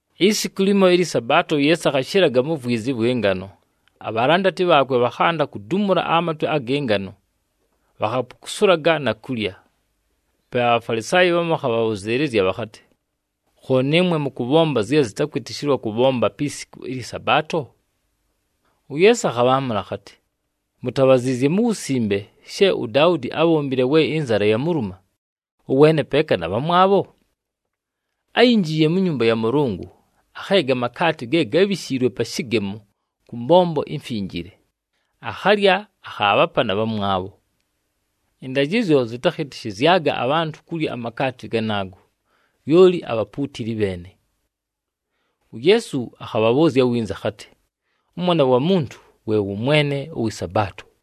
Isiku limo ɨlyɨ Sabaato, uYeesu akhashɨlaga mu vwizi ɨvwɨ ngano. Abhalandati bhaakwe bhakhanda kudumula amatwe agɨ ngano, bhakhapukusulaga na kulya. Pe aBhafalisaayi bhamu bhakhabhabhʉzɨɨlɨzya bhakhatɨ, “Khooni ɨmwe mʉkʉbhomba zye zɨtakwɨtɨshɨlwa kʉbhomba pi siku ɨlyɨ Sabaato?” UYeesu akhabhaamʉla akhatɨ, “Mutabhaziizye mu Wusimbe she uDaudi ábhombile we ɨnzala yabhaluma, ʉweene peeka na bhamwabho? Áyinjiiye mu nyumba ya Mʉlʉngʉ, akheega amakaati ge gábhishiilwe pa shɨgemo kʉ mbombo imfinjile, akhalya, akhaabhapa na bhamwabho. Ɨndajɨzyo zɨtakhɨtɨshɨzyaga abhantʉ kulya amakaati ganaago, lyoli abhapuutili bheene.” UYeesu akhabhabhʉʉzya winza akhatɨ, “ɄMwana wa Muntu we wʉ Mwene ʉwɨ Sabaato.”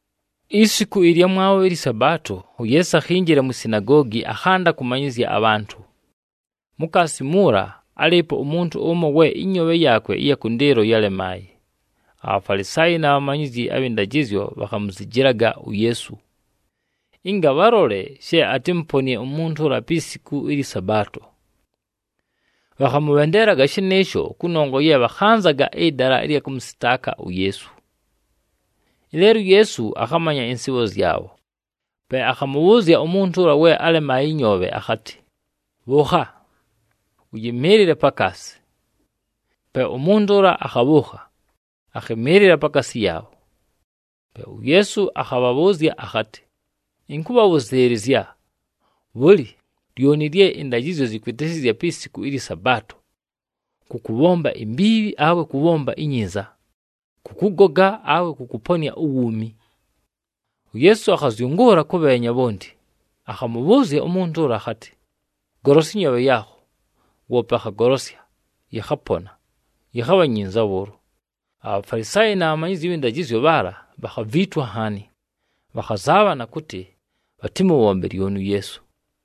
Isiku ɨlyamwabho ɨlyɨ Sabaato, uYeesu akhinjila mwi sinagoogi, akhanda kʉmanyɨzya abhantʉ. Mukaasi muula, álɨɨpo umuntu ʉmo we ɨnyoobhe yaakwe ɨya kʉndɨɨlo yálemaaye. ABhafalisaayi na bhamanyizyi abhɨ ndajɨzyo bhakhamuzijilaga uYeesu, ɨnga bhalole she atɨmʉponɨe umuntu ʉla pi siku ɨlyɨ Sabaato. Bhakhamʉbhendeelaga shɨnɨɨsho, kʉnongwa ye bhakhanzaga ɨdala ɨlya kʉmʉsɨtaaka uYeesu. Ɨleelo uYeesu akhamanya ɨnsɨɨbho zyabho. Pe akhamʉbhʉʉzya umuntu ʉla we álemaaye ɨnyoobhe akhatɨ, “Bhʉʉkha, ʉyɨmɨɨlɨle pakaasi.” Pe umuntu ʉla akhabhʉʉkha, akhɨmɨɨlɨla pakaasi yaabho. Pe uYeesu akhabhabhʉʉzya akhatɨ, “Ɨnkʉbhabhʉzɨɨlɨzya, bhʉlɨ, lyoni lye ɨndajɨzyo zɨkwɨtɨshɨzya pi siku ɨlyɨ Sabaato, kʉ kʉbhomba imbiibhi, awe kʉ kʉbhomba inyinza, kʉ kʉgoga awe kʉ kʉponɨa uwuumi?” UYeesu akhazyʉngʉʉla kʉbheenya bhonti, akhamʉbhʉʉzya umuntu ʉla akhatɨ, “Golosya ɨnyoobhe yaakho.” Woope akhagolosya, yɨkhapona, yɨkhabha nyinza bhʉʉlo. ABhafalisaayi na bhamanyizyi abhɨ ndajɨzyo bhaala bhakhaviitwa nhaani, bhakhazaabhana kʉtɨ bhatɨmʉbhombe lyoni uYeesu.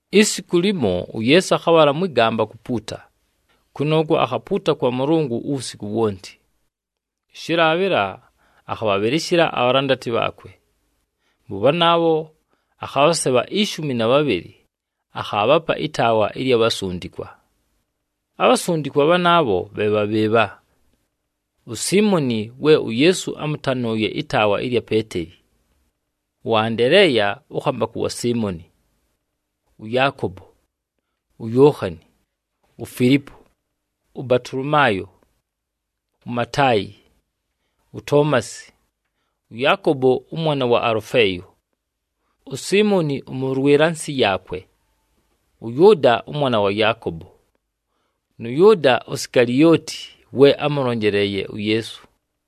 Isiku limo, uYeesu akhabhala mwɨ gamba kupuuta, kʉnʉʉkwo akhapuuta kwa Mʉlʉngʉ uwusiku wonti. Ɨshɨlaabhɨla, akhabhabhɨlɨshɨla abhalandati bhaakwe. Mʉ bhanaabho akhabhasebha ishumi na bhabhɨlɨ, akhaabhapa ɨtaawa ɨlya bhasundikwa. Abhasundikwa bhanaabho bhe bha bhɨɨbha: uSiimoni we uYeesu ámʉtanʉʉye ɨtaawa ɨlya Peeteli, ʉAndeleeya ʉkhambakʉ wa Siimoni, ʉYaakobo, uYookhani, uFilipo, ʉBatolomaayo, uMataayi, uToomasi, ʉYaakobo ʉmwana wa Alʉfeeyo, uSiimoni ʉmʉlwɨla nsɨ yaakwe, ʉYʉʉda ʉmwana wa Yaakobo, nʉ Yʉʉda Sikalioti, we ámʉlonjeleeye uYeesu.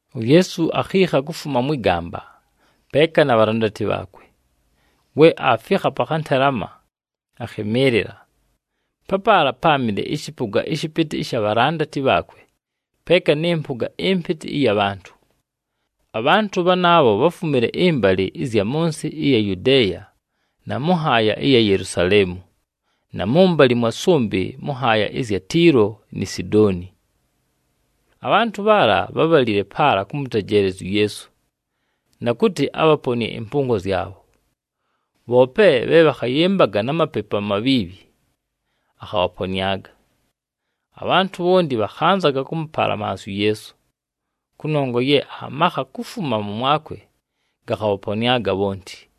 UYeesu akhiikha kufuma mwɨ gamba, peeka na bhalandati bhaakwe. We aafikha pa khantelama, akhɨmɨɨlɨla. Papaala páamɨle ɨshɨpʉga ɨshɨpɨtɨ ɨsha bhalandati bhaakwe, peeka nɨ mpʉga ɨmpɨtɨ ɨya bhantʉ. Abhantʉ bhanaabho bháfumile ɨmbalɨ ɨzya mʉ nsɨ ɨya Yudeeya na mʉ nhaaya ɨya Yelusaleemu, na mʉmbalɨ mwa sʉmbɨ mʉ nhaaya ɨzya Tiilo ni Sidooni. Abhantʉ bhaala bhábhalile paala kʉmʉtejeelezya uYeesu, na kʉtɨ abhaponɨe ɨmpʉngo zyabho. Bhoope bhe bhakhayɨmbaga na mapepu amabhiibhi, akhabhaponɨaga. Abhantʉ bhonti bhakhanzaga kʉmʉpalamansya uYeesu, kʉnongwa ye amakha kufuma mʉmwakwe gakhabhaponɨaga bhonti.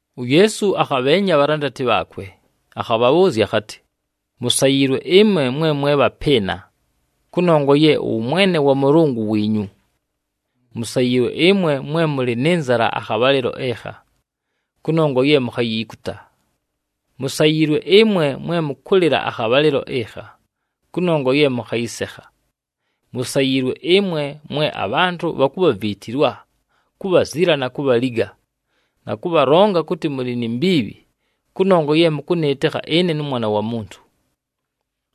UYeesu akhabheenya abhalandati bhaakwe, akhabhabhʉʉzya akhatɨ, “Musayiilwe ɨmwe, mwe mwe bhapɨɨna, kʉnongwa ye ʉwʉmwene wa Mʉlʉngʉ wiinyu. Musayiilwe ɨmwe, mwe mʉlɨ nɨ nzala akhabhalɨlo ɨkha, kʉnongwa ye mukhayiikuta. Musayiilwe ɨmwe, mwe mʉkʉlɨla akhabhalɨlo ɨkha, kʉnongwa ye mʉkhayɨsekha. Musayiilwe ɨmwe, mwe abhantʉ bhakubhaviitilwa, kubhazila na kubhaliga, na kʉbhalonga kʉtɨ mʉlɨ ni mbiibhi kʉnongwa ye mʉkʉmwɨtɨkha ʉMwana wa Muntu.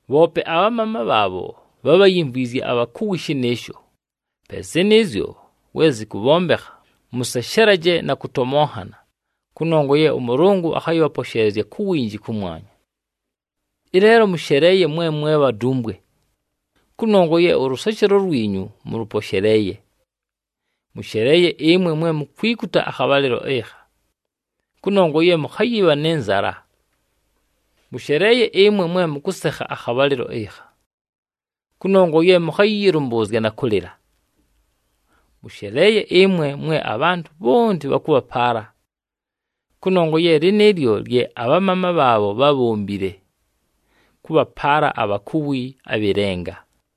“Bhoope abhamaama bhaabho, bhábhayimvwizye abhakuwi shɨnɨɨsho. Pe zɨnɨɨzyo we zɨkʉbhombekha, mʉseshelaje na kʉtomonhana, kʉnongwa ye ʉMʉlʉngʉ akhayɨbhaposheelezya ku winji kʉmwanya. Ɨleelo mʉsheleeye mwe mwe bhadumbwe, kʉnongwa ye ʉlʉseshelo lwinyu, mʉlʉposheleeye. Mʉsheleeye ɨmwe, mwe mukwikuta akhabhalɨlo ɨkha, kʉnongwa ye mʉkhayɨbha nɨ nzala. Mʉsheleeye ɨmwe, mwe mʉkʉsekha akhabhalɨlo ɨkha, kʉnongwa ye mʉkhayɨyɨlʉmbʉʉzya na kʉlɨla. Mʉsheleeye ɨmwe, mwe abhantʉ bhonti bhakʉbhapaala, kʉnongwa ye lɨnɨɨlyo lye abhamaama bhaabho bhábhombile, kʉbhapaala abhakuwi abhɨ lenga.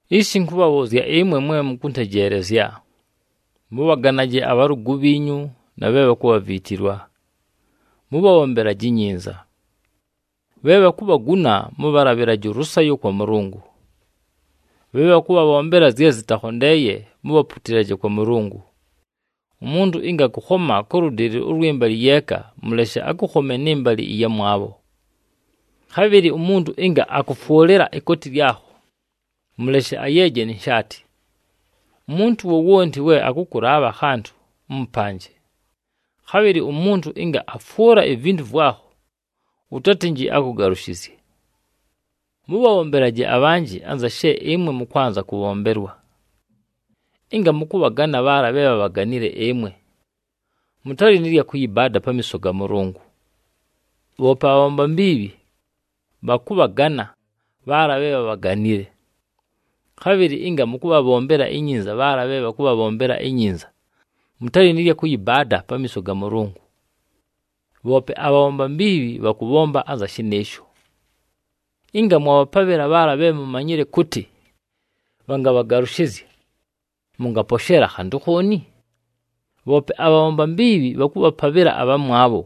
“Ishi, ɨnkʉbhabhʉʉzya ɨmwe mwe mʉkʉtejeelezya, mʉbhaganaje abhalʉgʉ bhiinyu, na bhe bhakubhaviitilwa, mʉbhabhombelaje inyinza. Bhe bhakubhaguna mʉbhalabhɨlaje ʉlʉsayo kwa Mʉlʉngʉ. Bhe bhakʉbhabhombela zye zɨtakhondeeye, mubhaputilaje kwa Mʉlʉngʉ. Umuntu ɨnga akʉkhoma kʉ lʉdɨlɨ ʉlwɨ mbalɨ yeeka, mʉleshe akʉkhome nɨ mbalɨ ɨyamwabho. Khabhɨlɨ umuntu ɨnga akʉfwʉlɨla ikooti lyakho, mʉleshe ayeeje ni nshaati. Umuntu wowonti we akʉkʉlaabha akhantʉ, ʉmʉpanje. Khabhɨlɨ umuntu ɨnga afwʉla ivintu vwakho, ʉtatɨnjɨ akʉgalʉshɨzye. Mʉbhabhombelaje abhanjɨ anza she nɨɨmwe mʉkwanza kʉbhombelwa. “Ɨnga mʉkʉbhagana bhaala bhe bhabhaganile ɨmwe, mʉtalɨ nɨ lya kʉyɨbaada pamiiso ga Mʉlʉngʉ. Bhoope abhabhomba mbiibhi, bhakʉbhagana bhaala bhe bhabhaganile! Khabhɨlɨ ɨnga mʉkʉbhabhombela inyinza bhaala bhe bhakʉbhabhombela inyinza, mʉtalɨ nɨ lya kʉyɨbaada pamiiso ga Mʉlʉngʉ. Bhoope abhabhomba mbiibhi bhakʉbhomba anza shɨnɨɨsho! Ɨnga mwabhapabhɨla bhaala bhe mumanyile kʉtɨ bhangabhagalʉshɨzya, mʉngaposheela khantʉ khooni? Bhoope abhabhomba mbiibhi bhakʉbhapabhɨla abhamwabho,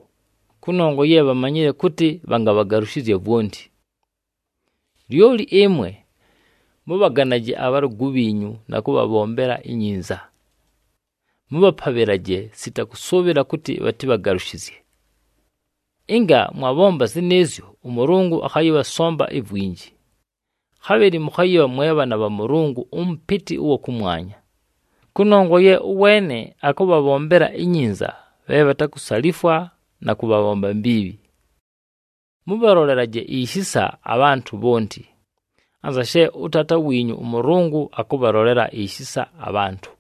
kʉnongwa ye bhamanyile kʉtɨ, bhangabhagalʉshɨzya vwonti! “Lyoli ɨmwe, mʉbhaganaje abhalʉgʉ bhiinyu na kʉbhabhombela inyinza. Mʉbhapabhɨlaje, sita kʉsʉʉbhɨla kʉtɨ bhatɨbhagalʉshɨzye. Ɨnga mwabhomba zɨnɨɨzyo, ʉMʉlʉngʉ akhayɨbhasomba ivwinji. Khabhɨlɨ mʉkhayɨbha mwe bhaana bha Mʉlʉngʉ ʉMʉpɨtɨ ʉwa kʉmwanya, kʉnongwa ye ʉweene akʉbhabhombela inyinza bhe bhatakusalifwa na kʉ bhabhomba mbiibhi. Mʉbhalolelaje ishisa abhantʉ bhonti, anza she ʉTaata wiinyu ʉMʉlʉngʉ akʉbhalolela ishisa abhantʉ.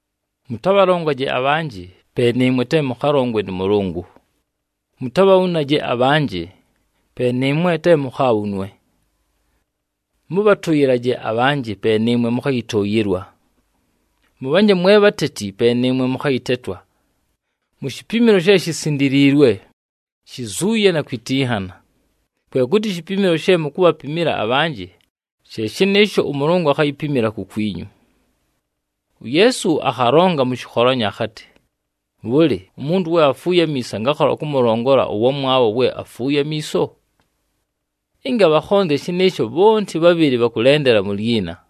“Mʉtabhalongaje abhanjɨ, pe nɨɨmwe te mʉkhalongwe nʉ Mʉlʉngʉ. Mutabhabhunaje abhanjɨ, pe nɨɨmwe te mukhaabhunwe. Mʉbhatʉyɨlaje abhanjɨ, pe nɨɨmwe mʉkhayɨtʉʉyɨlwa. Mʉbhanje mwe bhateti, pe nɨɨmwe mʉkhayɨtetwa, mu shipimilo she shisindiliilwe, shizuuye na kwitinhana. Kwe kʉtɨ ishipimilo she mukubhapimila abhanjɨ, she shɨnɨɨsho ʉMʉlʉngʉ akhayipimila kukwinyu.” UYeesu akhalonga mʉ shɨkholanyo akhatɨ, “Bhʉlɨ, umuntu we afuuye amiiso angakhola kʉmʉlongola ʉwamwabho we afuuye amiiso? Ɨnga bhakhonzya shɨnɨɨsho, bhonti bhabhɨlɨ bhakʉlendela mu lyina.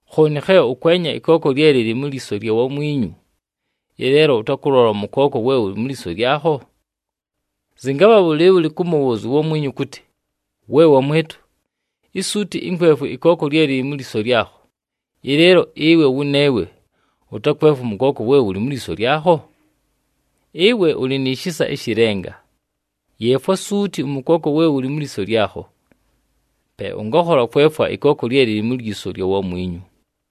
“Khooni khe ʉkwenya ɨkooko lye lɨlɨ mu lyiso lya wamwinyu, ɨleelo ʉtakʉlola ʉmʉkooko we wʉlɨ mu lyiso lyakho? Zɨngabha bhʉlɨɨbhʉlɨ kʉmʉbhʉʉzya uwamwinyu kʉtɨ, ‘We wamwɨtʉ, isuuti ɨnkwefwe ɨkooko lye lɨlɨ mu lyiso lyakho,’ ɨleelo ɨwe wʉneewe ʉtakwefwa ʉmʉkooko we wʉlɨ mu lyiso lyakho? Ɨwe ʉlɨ ni shisa ɨshɨ lenga! Yeefwa suuti ʉmʉkooko we wʉlɨ mu lyiso lyakho. Pe ʉngakhola kwefwa ɨkooko lye lɨlɨ mu lyiso lya wamwinyu.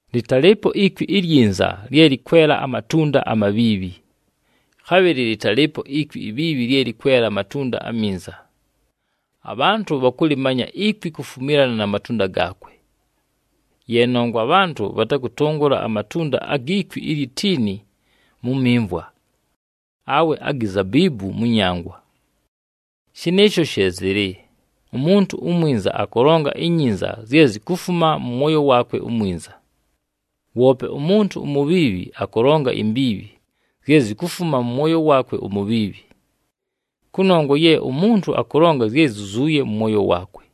“Lɨtalɨɨpo ikwi ilyinza lye lɨkwela amatunda amabhiibhi, khabhɨlɨ lɨtalɨɨpo ikwi ibhiibhi lye lɨkwela amatunda aminza. Abhantʉ bhakʉlɨmanya ikwi kufumilana na matunda gaakwe, ye nongwa abhantʉ bhatakʉtʉngʉla amatunda agi kwi ilyi tiini mu mimvwa, awe agi zabiibu mʉ nyangwa. Shɨnɨɨsho she zɨlɨ, umuntu umwinza akʉlonga inyinza, zye zikufuma mʉ mwoyo waakwe umwinza. Woope umuntu umubhiibhi akʉlonga imbiibhi, zye zikufuma mʉ mwoyo waakwe umubhiibhi. Kʉnongwa ye umuntu akʉlonga zye zyizuuye mʉ mwoyo waakwe.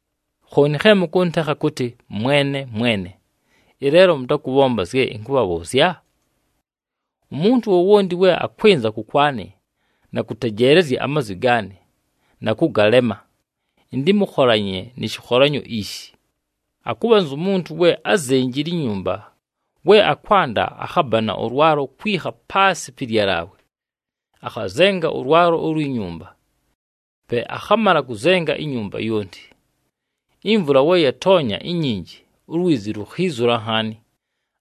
“Khooni khe mʉkʉntekha kʉtɨ, ‘Mwene, Mwene,’ ɨleelo mʉtakʉbhomba zye ɨnkʉbhabhʉʉzya? Umuntu wowonti we akwɨnza kʉkwanɨ, na kʉtejeelezya amazwi gaanɨ na kʉgalema, ɨntɨmʉkholanye nɨ shɨkholanyo ishi: “Akʉbha anzu muntu we ázenjile inyumba. We akwanda, akhabana ʉlwalo kwikha paasɨ pɨ lyalaawe, akhazenga ʉlwalo ulwi nyumba, pe akhamala kʉzenga inyumba yonti. Imvula we yatoonya inyinji, ulwizi lukhiizula nhaani,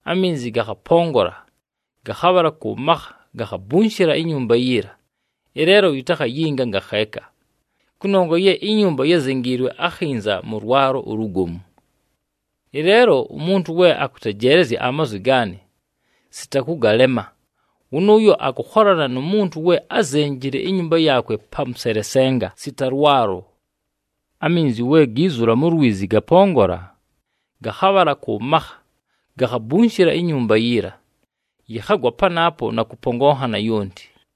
aminzi gakhapongola, gakhabhala kʉ makha, gakhabunshila inyumba yiila, ɨleelo yitakhayinga ngakheeka, kʉnongwa ye inyumba yázenjiilwe akhinza mʉ lwalo ulugomu. Ɨleelo umuntu we akʉtejeelezya amazwi gaanɨ, sita kʉgalema, wʉnʉʉyo akʉkholana nu muntu we ázenjile inyumba yaakwe pa mʉselesenga sita lwalo. Aminzi we giizula mu lwizi gapongola, gakhabhala kʉ makha, gakhabunshila inyumba yiila, yɨkhagwa panaapo na kʉpongonhana yonti.”